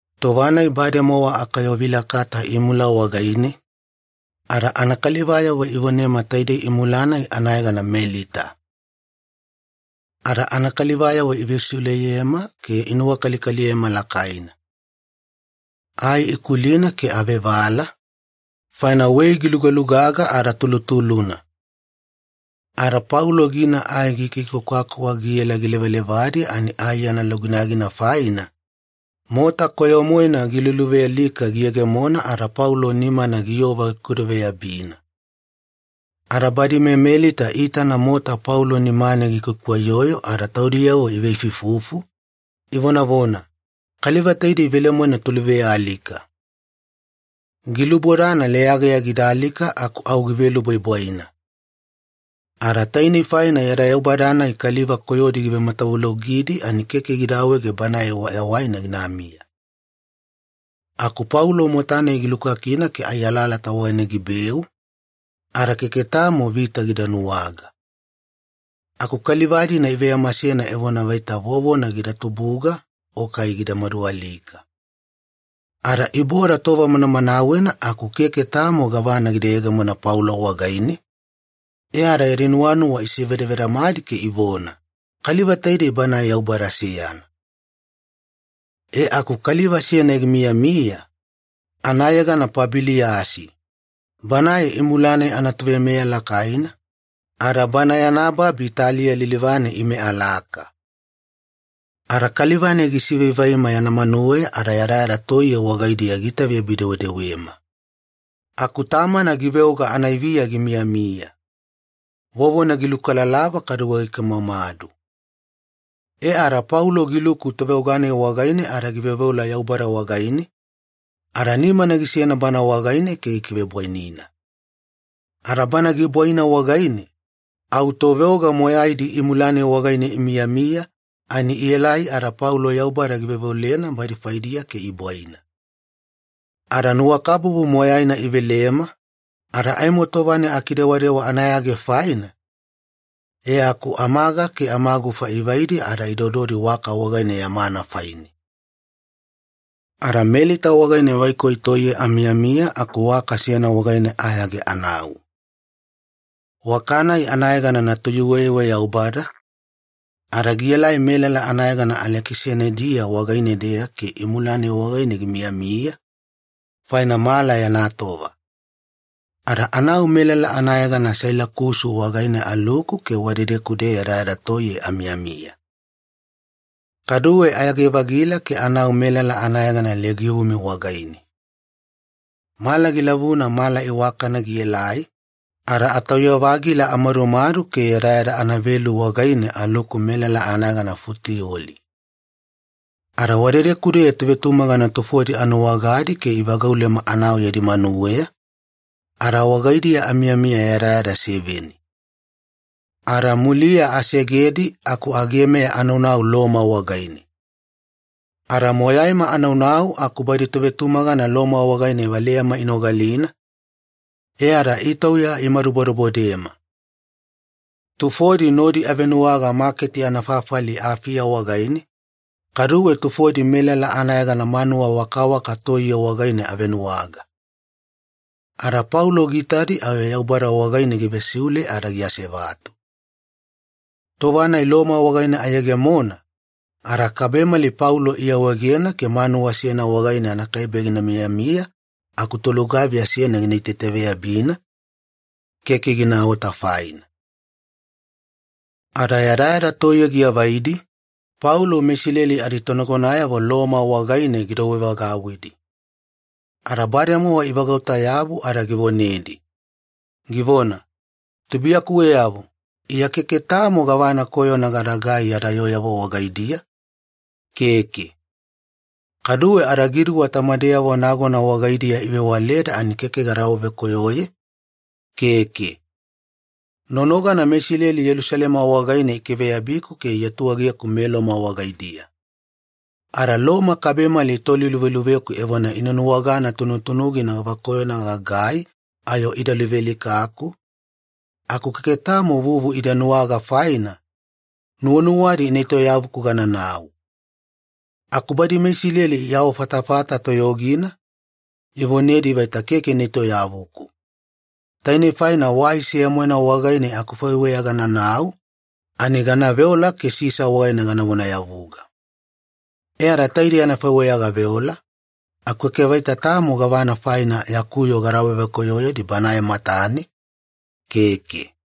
Tova-nai bademowa akayovilakata imula wagaine, ada anakalivayavo ivonema taidei imula-nai anayegana Melita. Ada anakalivayavo ivesiuleyema ke inuwakalikaliyema lakaina. Ai ikulina ke avevala, faina wei gilugalugaga ada tulutuluna. Ada Paulo gina ai gikikwakwakwa giela gilevalevadi ani ai yana luginagina faina, mota koyo-moena giluluvealika giyegemona ada Paulo nimana giyova gikudaveyabina. Ada badi meMelita iitana mota Paulo nimane gikwaikwaiyoyo ada taudiyavo iveifuifufu, ivonavona, “Kaliva taidei velemoena toluvealika. Gilubodana leyageya gida alika aku au givelubwaibwaina. Ada tainei faina yada yaubada-nai kaliva koyodi givematavulogidi ani keke gida awaege banae wayawaina ginamiya.” Aku Paulo mota-nai gilukakina ke ai alalata wagaine gibeu, ada keke tamo vita gida nuwaga. Aku kaliva-dina iveyamasena evona vaita vovona gida tubuga o kai gida madualika. Ada iboda tova manamanawena aku keke tamo gavana gida yegemona Paulo wagaine, e ada yadi nuwanuwa isevedavedamedi ke ivona, “Kaliva taidei banae yaubada seyana.” E aku kaliva seyana gimiyamiya, anayegana Pabiliyasi. Banae imula-nai anatoveimeya lakaina, ada bana yana babi taliya lilivane ime alaka. Ada kaliva-nai gisivaivaima yana manuweya ada yadayada toiye wagaidiya giitaveyabi-dewedewema. Aku tamana giveoga anaiviya gimiyamiya. Vovona gilukalalava kaduwe gikamomadu. E ada Paulo giluku toveoga-nai wagaine ada giveoveola Yaubada wagaine, ada nimana gisena bana wagaine ke gikivebwainina. Ada bana gibwaina wagaine, au toveoga moyaidi imula-nai wagaine imiyamiya ani ielai ada Paulo Yaubada giveoveolena badi faidiya ke ibwaina. Ada nuwakabubu moyaina ivelema, ada aimo tova-nai akidewadewa anayage faina, e aku amaga ke amagufa ivaidi ada idododi waka wagaine yamana faine. Ada Melita wagaine vaikoi toiye amiyamiya aku waka seyana wagaine ayage anau. Waka-nai anayegana ‘Natuyuweyuwe Yaubada’, ada gielai melala anayegana Alekisanidia wagaine-deya ke imula-nai wagaine gimiyamiya, faina mala yana tova. Ada anau melala anayegana Sailakusu wagaine aluku ke wadedeku-deya yadayada toiye amiyamiya. Kaduwe ayage-vagila ke anau melala anayegana Legiumi wagaine. Mala gilavuna mala iwakana gielai, ada atauya-vagila amadumadu ke yadayada anavelu wagaine aluku melala anayegana Futioli. Ada wadedeku-deya tovetumagana tufodi anuwagadi ke ivagaulema anau yadi manuweya, ada wagaidiya amiyamiya yadayada seveni. Ada muliya asegedi aku agemeya anaunau Loma wagaine. Ada moyaima anaunau aku badi tovetumagana Loma wagaine valeyama inogalina, e ada itauya inamadu bodebodema. Tufodi nodi avenuwaga maketi anafafali Afiya wagaine, kaduwe tufodi melala anayegana Manuwa Wakawaka Toiye wagaine avenuwaga. Ada Paulo giitadi ayo Yaubada wagaine givesiule ada giasevatu. Tova-nai Loma wagaine ayegemona, ada kabemali Paulo iawaegena ke manuwa seyana wagaine anakaibe gina miyamiya aku tolugaviya seyana gina itaitaveyabina, keke ginaota faina. Ada yadayada toiye giavaidi, Paulo meIsileli aditonagonayavo Loma wagaine gidouwevagauwidi. Ada bademowa ivagauta-yabu ada givonedi, givona, “Tubuiyakuweyavo, Iya keke tamo gavana koyona gadagai yada yooyavo wagaidiya, keke. Kaduwe adagiduwa tamadeyavo nagona wagaidiya ivewaleda ani keke gada awavekoyoye, keke. Nonogana meIsileli Yelusalema wagaine ikiveyabiku ke iatuegeku meLoma wagaidiya. Ada Loma kabemali itoliluveluveku evona ina nuwagana tunutunugina gavakoyona gagai ayo ida luvealikaku, aku keke tamo vuvu ida nuwaga faina, nuwanuwadi ina etoyavuku gananau. Aku badi meIsileli iawafatafata toyogina, ivonedi vaita keke ina etoyavuku. Tainei faina wai seya-moena wagaine akufaiweya gananau, ani gana veola ke Sisa wagaine gana vonayavuga. E ada taidei anafaiweya gaveola, aku keke vaita tamo gavana faina yaku yoo gada awavekoyoyedi banae matane, keke.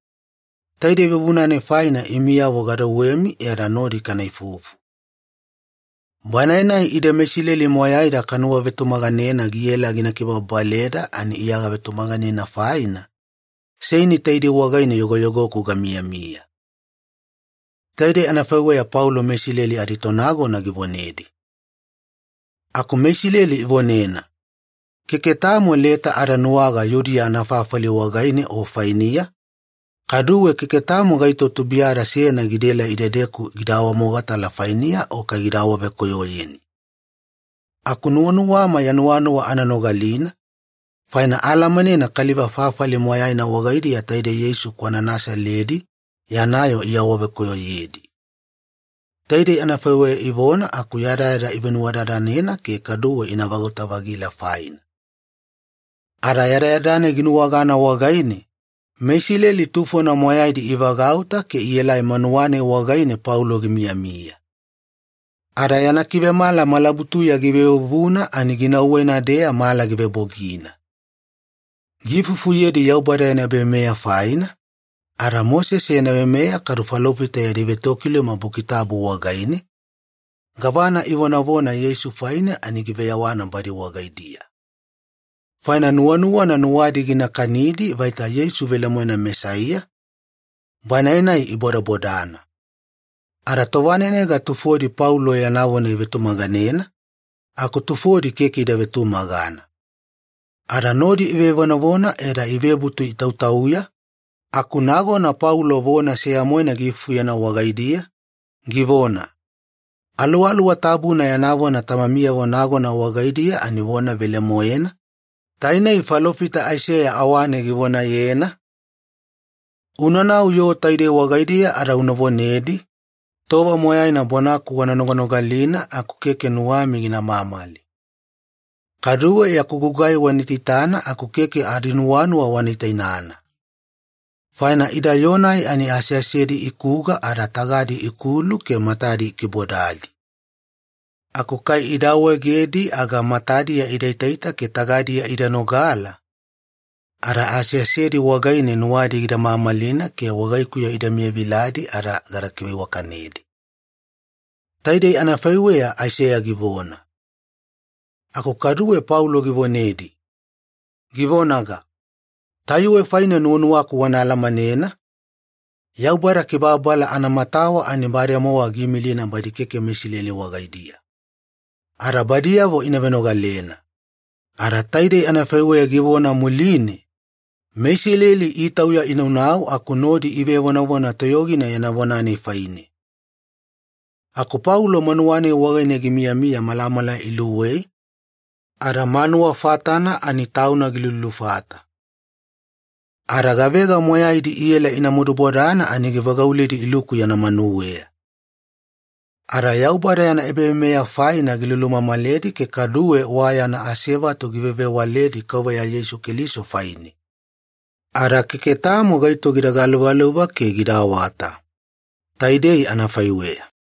Taide vuvuna-nai faina imiyavo gadouwevagauwimi e ada nodi kana ifufu. Banae-nai ide meIsileli moyaida kanuwavetumaganena ginaela gina kibababaleda ani Iya gavetumaganena faina, seini taidei wagaine yogoyogoku gamiyamiya.” Taidei anafaiweya Paulo meIsileli aditonagona givonedi. Aku meIsileli ivonena, “Keke tamo leta ada nuwaga Yudiya anafafali wagaine o fainiya, kaduwe keke tamo gaito tubuiyada seyana gidaelai idedeku gida awamogatala fainiya o kai gida awavekoyoyeni. Aku nuwanuwama ya nuwanuwa ana nogalina, faina aalamanena kaliva fafali moyaina wagaidiya taidei Yeisu kwana Nasaledi yana yoo iawavekoyoyedi.” Taidei anafaiweya ivona aku yadayada ivenuwadadanena ke kaduwe ina vagauta-vagila faina. Ada yadayada-nai ginuwagana wagaine, meIsileli tufona moyaidi ivagauta ke ielai manuwa-nai wagaine Paulo gimiyamiya. Ada yana kivemala malabutuya givevuvuna ani ginauwena-deya mala givebogina. Giifufuyedi Yaubada yana ebaveimeya faina, ada Mosese yana veimeya kadu falofita yadi vetokiluma Buki Tabu wagaine, gavana ivonavona Yeisu faine ani giveyawana badi wagaidiya. Faina nuwanuwana nuwadi gina kanidi vaita Yeisu velemoena Mesaiya, Banae-nai ibodabodana. Ada tovanenega tufodi Paulo yana vona ivetumaganena, aku tufodi keke ida vetumagana. Ada nodi ivevonavona e ada ivebutu itautauya, aku nagona Paulo vona seya-moena giifufuyena wagaidiya, givona, “Aluwaluwa Tabuna yana vona tamamiyavo nagona wagaidiya ani givona velemoena, tainei falofita Aiseya awane givonayena, ‘Unanau yoo taidei wagaidiya ada una vonedi, “Tova moyaina bonaku wana noganogalina aku keke nuwami gina mamali. Kaduwe yaku gugai wana itaitana aku keke adinuwanuwa wana itainana.” Faina ida yoo-nai ani aseasedi ikuga ada tagadi ikulu ke matadi ikibodadi. Aku kai ida awaegedi aga matadiya idaita ke tagadiya ida nogala, ada aseasedi wagaine nuwadi gida mamalina ke wagaikuya ida miyaviladi ada gada kiveiwakanedi.’ Taidei anafaiweya Aiseya givona.” Ada kaduwe Paulo givonedi, givonaga, “Tayuwe faine nuwanuwaku wana alamanena, Yaubada kibababala anamatawa ani bademowa giimilina badi keke meIsileli wagaidiya. Ada badiyavo ina venogalena.” Ada taidei anafaiweya givona muline, meIsileli itauya inaunau aku nodi ivevonavona toyogina yana vona-nai faine. Aku Paulo manuwa-nai wagaine gimiyamiya malamala iluwei, ada manuwa fatana ani tauna gilulufata. Ada gavega moyaidi iela ina madubodana ani givagauledi iluku yana manuweya. Ada Yaubada yana ebaveimeya faina gilulumamaledi ke kaduwe wa yana asevatu givevewaledi Kauveya Yeisu Keliso faine. Ada keke tamo gaito gida galuvaluva ke gida awata. Taidei anafaiweya.